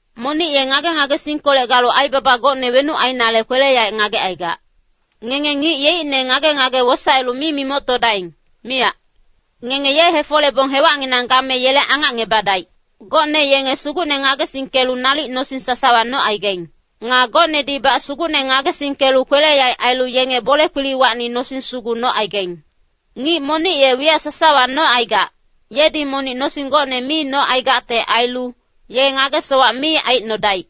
Monic ye ngage-ngagesingkolec galu aibaba gocne wenuc ainale kwele-yaec ngagecaigac. Ngenge ngic yeicne ngage-ngage wosaelu mi mimoctodaing, miyac. Ngenge ye hefolebong hewacnginang game yele angacngebadaic. Gocne yenge Sugucne ngagesingkelu nalic nosing sasawa nocaigaing. Nga gocnedibac Sugucne ngagesingkelu kwele-yaec ailu yenge bole-kpiliwacni nosing sugu nocaigaing. Ngic monic ye wiyac sasawa nocaigac, yedi monic nosing gocne mi nocaigacte ailu, ye ngage-sowac mi aicnodaic.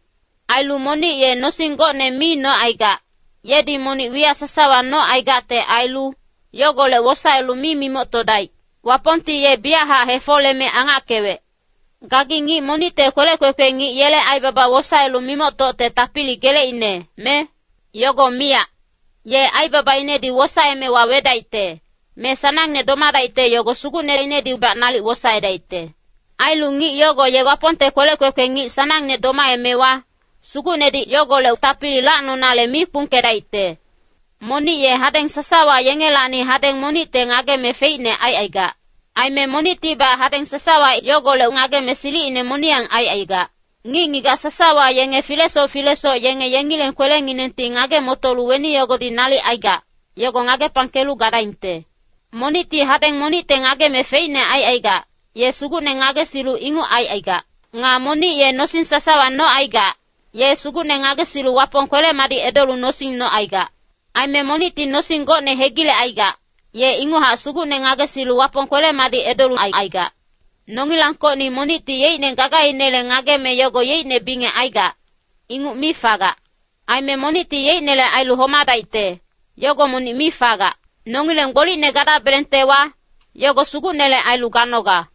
Ailu monic ye nosing gocne mi nocaigac, yedi monic wiyac sasawa nocaigacte ailu, yogolec wosaelu mi mimoctodaic. Wapongti ye biyachac hefoleme angackewec. Gagi ngic monicte kwelec kwekwe ngic yele aibaba wosaelu mimoctocte tapili geleicne, me? Yogo miyac. Ye aibabainedi wosaeme wawedaicte, me sanangne domadaicte yogo sugucneinedibac nalic wosaedaicte. Ailu ngic yogo ye Wapongte kwelec kwekwe ngic sanangne domaemewa, Sugucnedi yogolec tapili lacnonale mi kpungkedaicte. Monic ye hadeng sasawa yengelacni hadeng monicte ngageme feicne aicaigac. Aime monictibac hadeng sasawa yogolec ngageme silicine moniyang aicaigac. Ngic-ngigac sasawa yenge filesoc filesoc yenge yengileng kwelenginengti ngage-motolu weni yogodi nalic aigac, yogo ngagepangkelu gadaingte. Monicti hadeng monicte ngageme feicne aicaigac, ye Sugucne ngagesilu inguc aicaigac. Nga monic ye nosing sasawa nocaigac, ye Sugucne ngagesilu Wapong kwele-madic edolu nosing nocaigac. Aime monicti nosing gocne hegilecaigac, ye inguchac Sugucne ngagesilu Wapong kwele-madic edolu aicaigac. Nongilangkocni monicti yeicne gagainele ngageme yogo yeicne bingec aigac, inguc mi fagac. Aime monicti yeicnele ailu homadaicte, yogo monic mi fagac. Nongileng gbolicne gadabelengtewa, yogo Sugucnele ailu ganoga.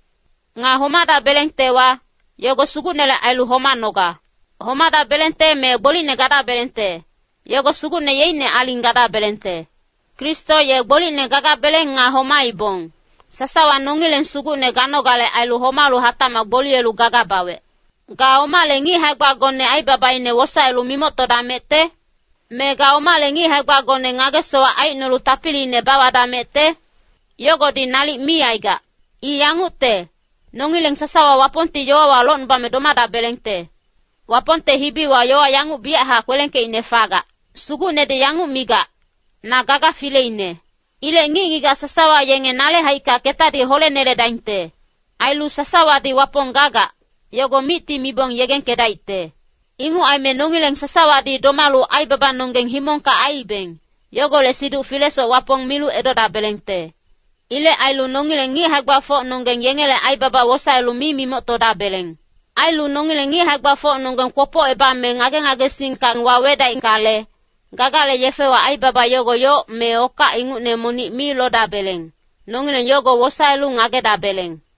Nga homadabelengtewa, yogo Sugucnele ailu homanoga. Homadabelengte me gbolicne gadabelengte, yogo Sugucne yeicne aling gadabelengte. Kristo ye gbolicne gagabeleng nga homaibong, sasawa nongileng Sugucne ganogale ailu homalu hatacmac gboliyelu gaga bawec. Ga omale ngic hae-gbagone aibabaine wosaelu mimoctodamecte? Me ga omale ngic hae-gbagone ngage-sowac aicnolu tapiliine bawadamecte? Yogodi nalic mi aigac. I yangucte, nongileng sasawa Wapongti yowawa locnubame domadabelengte. Wapongte hibiwa yowa yanguc biyachac kwelengkeicne fagac, “Sugucnedi yanguc migac, ‘Na gaga fileine. Ilec ngic-ngigac sasawa yenge nale haicka ketadi holeneledaingte. Ailu sasawadi Wapong gagac, yogo micti mibong yegengkedaicte.’” Inguc aime nongileng sasawadi domalu aibabanonggeng himongka aiibeng, yogolec siduc filesoc Wapong milu edodabelengte. Ilec ailu nongileng ngic hae-gbafocnonggeng yengele aibaba wosaelu mi mimoctodabeleng. Ailu nongileng ngic hae-gbafocnonggeng kwopocebame ngage-ngagesingka wawedaingkale, gagale yefewa aibaba yogo yoc me okac ingucne monic mi lodabeleng, nongileng yogo wosaelu ngagedabeleng.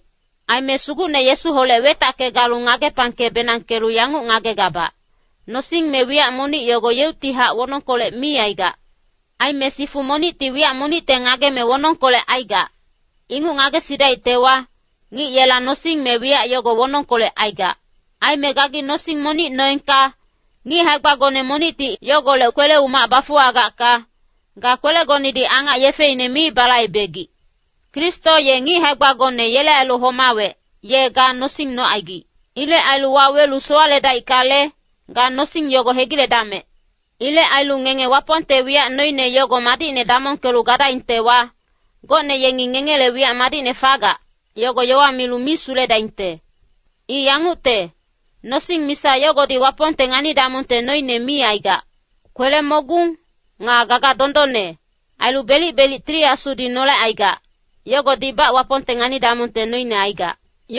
Aime Sugucne Yesuholec wetacke galu ngagepangke-benangkelu yanguc ngagegabac, nosing me wiyac monic yogo yeuctihac wonongkolec mi aigac. Aime sifu monicti wiyac monicte ngageme wonongkolec aigac, inguc ngagesidaictewa, ngic yela nosing me wiyac yogo wonongkolec aigac. Aime gagi nosing monic noengka, ngic hae-gbagone monicti yogolec kwele-umac bafuwagacka, ga kwelegonedi angac yefeine mi balaibegic. Kristo ye ngic hae-gbagone yele ailu homawec, ye ga nosing nocaigic. Ilec ailu wawelu sowaledaickale, ga nosing yogo hegiledamec. Ilec ailu ngenge Wapongte wiyac noine yogo madicne damongkelu gadaingtewa, gocne yengi ngengele wiyac madicne fagac, yogo yowa milu mi suledaingte. I yangucte, nosing misa yogodi Wapongte ngani-damongte noine mi aigac. Kwele-mogung, nga gaga dondonne, ailu belic-belic Tili Asudi nolecaigac, yogodibac Wapongte ngani-damongte noine aigac.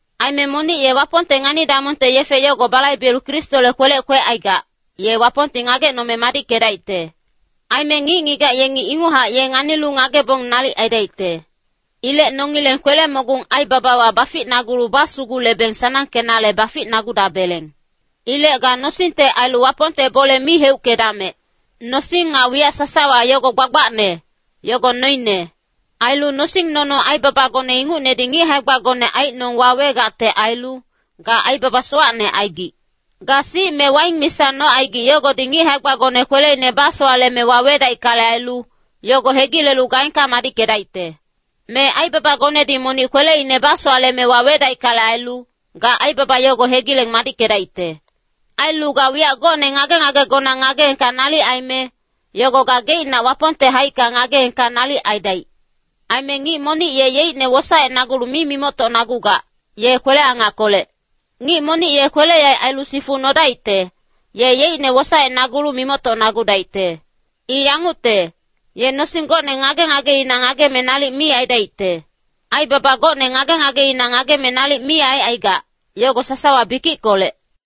Aime monic ye Wapongte ngani-damongte yefe yogo balaibelu Kristole kwelec kwecaigac, ye Wapongti ngagecnome madickedaicte. Aime ngic-ngigac yengi inguchac ye nganilu ngagebong nalic aidaicte. Ilec nongileng kwele-mogung aibabawa baficnagulu basugulebeng sanangkenale baficnagudabeleng. Ilec ga nosingte ailu Wapongte bole mi heuckedamec. Nosing nga wiyac sasawa yogo gbagbacne, yogo noine. Ailu nosing-nono aibabagone ingucnedi ngic hae-gbagone aicnong wawegacte ailu, ga aibaba sowacne aigic. Ga sic me waing misa nocaigic yogodi ngic hae-gbagone kweleine basowaleme wawedaickale ailu, yogo hegilelu gaengka madickedaicte. Me aibabagonedi monic kweleine basowaleme wawedaickale ailu, ga aibaba yogo hegileng madickedaicte. Ailu ga wiyac gocne ngage-ngagegona ngageengka nalic aime, yogo ga geicnac Wapongte haicka ngageengka nalic aidaic. Aime ngic monic ye yeicne wosaecnagulu mi mimoctocnagugac, ye kwele-angackolec. Ngic monic ye kwele-yaec ailu sifu nodaicte, ye yeicne wosaecnagulu mimoctocnagudaicte. I yangucte, ye nosing gocne ngage-ngageina ngageme nalic mi aidaicte. Aibaba gocne ngage-ngageina ngageme nalic mi aicaigac, yogo sasawa bikickolec.